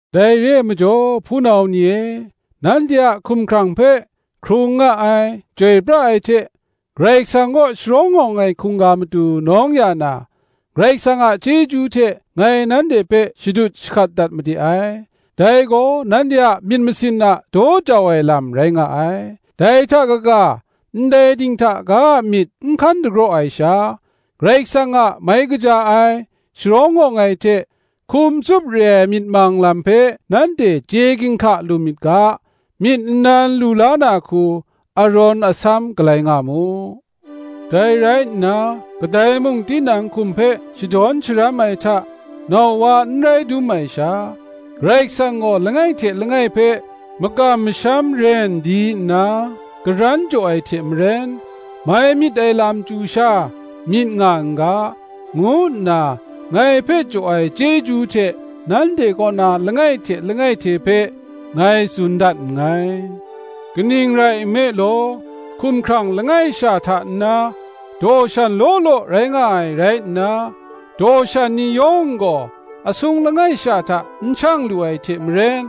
Dai re ai majaw, hpunau ni e, nanhte a hkumhkrang hpe, hkrung nga ai, chyoi pra ai hte, Karai Kasang kaw sharawng awng ai hkungga matu nawng ya na, Karai Kasang a chyeju hte ngai nanhte hpe shadut shahkat dat made ai: dai gaw nanhte a myit masin a daw jau ai lam rai nga ai. Dai hta kaga, ndai dinghta ga a myit n hkan dagraw ai sha, Karai Kasang a mai kaja ai, sharawng awng ai hte hkum tsup re ai myit mang lam hpe nanhte chye ginhka lu myit ga, myit nnan lu la na hku arawn asam galai nga mu. Dai rai nna, kadai mung tinang hkum hpe shadawn sharam ai hta nau wa n rai dum ai sha, Karai Kasang gaw langai hte langai hpe makam masham ren di nna karan jaw ai hte maren, mai myit ai lam chyu sha myit nga n ga, ngu nna ngai hpe jaw ai chyeju hte, nanhte kaw na langai hte langai hte hpe, ngai tsun dat nngai. Kaning rai nme law, hkumhkrang langai sha hta nna, daw shan law law rai nga ai rai nna, daw shan ni yawng gaw asung langai sha hta n shang lu ai hte maren,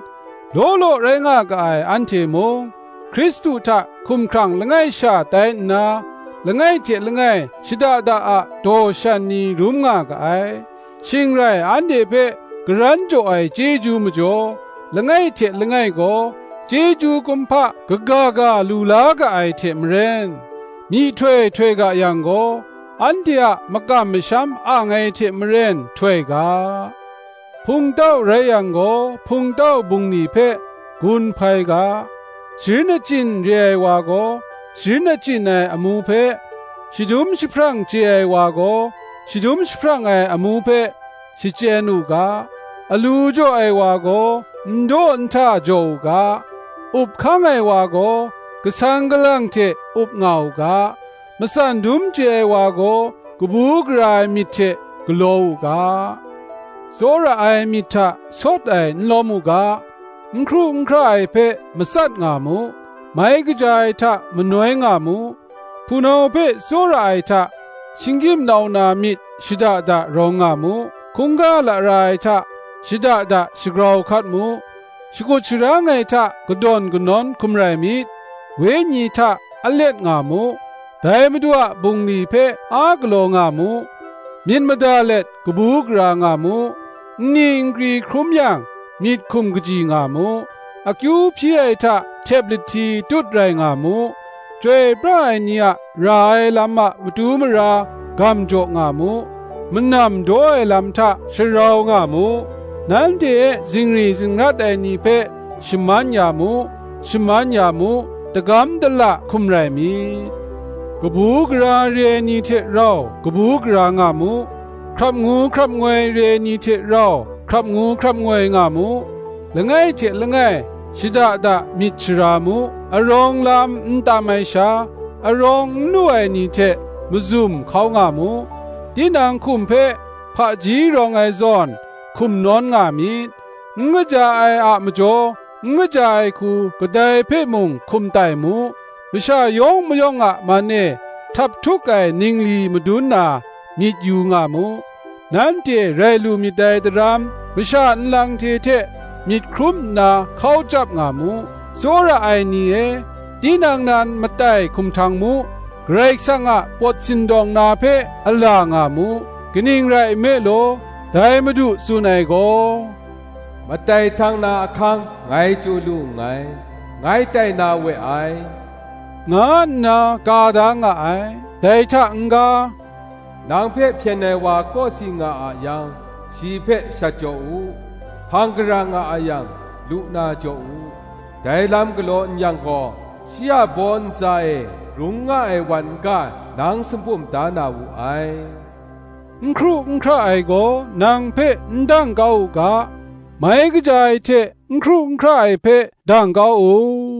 law law rai nga ga ai anhte mung, Hkristu hta hkumhkrang langai sha tai nna, langai hte langai shada da a daw shan ni rum nga ga ai. Shing rai anhte hpe karan jaw ai chyeju majaw, langai hte langai gaw chyeju kumhpa kaga ga lu la ga ai hte maren, myihtoi htoi ga yang gaw, anhte a makam masham ang ai hte maren htoi ga; hpungtau rai yang gaw, hpungtau bungli hpe gun hpai ga; sharin achyin re ai wa gaw, sharin achyin ai amu hpe, shadum jahprang chye ai wa gaw, shadum jahprang ai amu hpe, shachyen u ga; alu jaw ai wa gaw n daw n hta jaw u ga; up hkang ai wa gaw, kasang kalang hte up nga u ga; matsan dum chye ai wa gaw, kabu gara ai myit hte galaw u ga. Tsawra ai myit hta sawt ai n lawm u ga; n hkru n hkra ai hpe matsat nga mu, mai kaja ai hta manoi nga mu. Hpunau hpe tsawra ai hta, shinggyim nau na myit shada da rawng nga mu; hkungga lara ai hta shada da shagrau hkat mu; shakut sharang ai hta kadawn kanawn hkum rai myit; wenyi hta alet nga mu; dai Madu a bungli hpe a galaw nga mu; myit mada let kabu gara nga mu; nni nkri hkrum yang, myit hkum kaji nga mu; akyu hpyi ai hta htep lahti tut rai nga mu; chyoi pra ai ni a ra ai lam a matu mara gam jaw nga mu; manam daw ai lam hta sharau nga mu. Nanhte e zingri zingrat ai ni hpe shaman ya mu; shaman ya mu, dagam dala hkum rai myit. Kabu gara re ai ni hte rau kabu gara nga mu; hkrap ngu hkrap ngoi re ai ni hte rau hkrap ngu hkrap ngoi nga mu. Langai hte langai shada da myit shara mu; arawng lam n tam ai sha, arawng n lu ai ni hte mazum hkau nga mu. Tinang hkum hpe hpaji rawng ai zawn, hkum nawn nga myit. N kaja ai a majaw, n kaja ai hku kadai hpe mung hkum tai mu, Masha yawng mayawng a man e htaphtuk ai ningli madun na, myit yu nga mu. Nanhte rai lu myit dai daram, masha nlang hte hte myit hkrum nna hkau chyap nga mu. Tsawra ai ni e, tinang nan matai hkum htang mu; Karai Kasang a pawt sindawng na hpe ala nga mu: kaning rai nme law, dai Madu tsun ai gaw, Matai htang na ahkang ngai chyu lu nngai, ngai tai na we ai, nga nna ka da nga ai. Dai hta n-ga, nang hpe hpyen ai wa kawsi nga a yang, shi hpe shat jaw u; hpang gara nga a yang, lu na jaw u: dai lam galaw n yang gaw, shi a baw ntsa e grung nga ai wan n-ga nang sumpum da na wu ai. N hkru n hkra ai gaw nang hpe n dang kau u ga; mai kaja ai hte n hkru n hkra ai hpe dang kau u.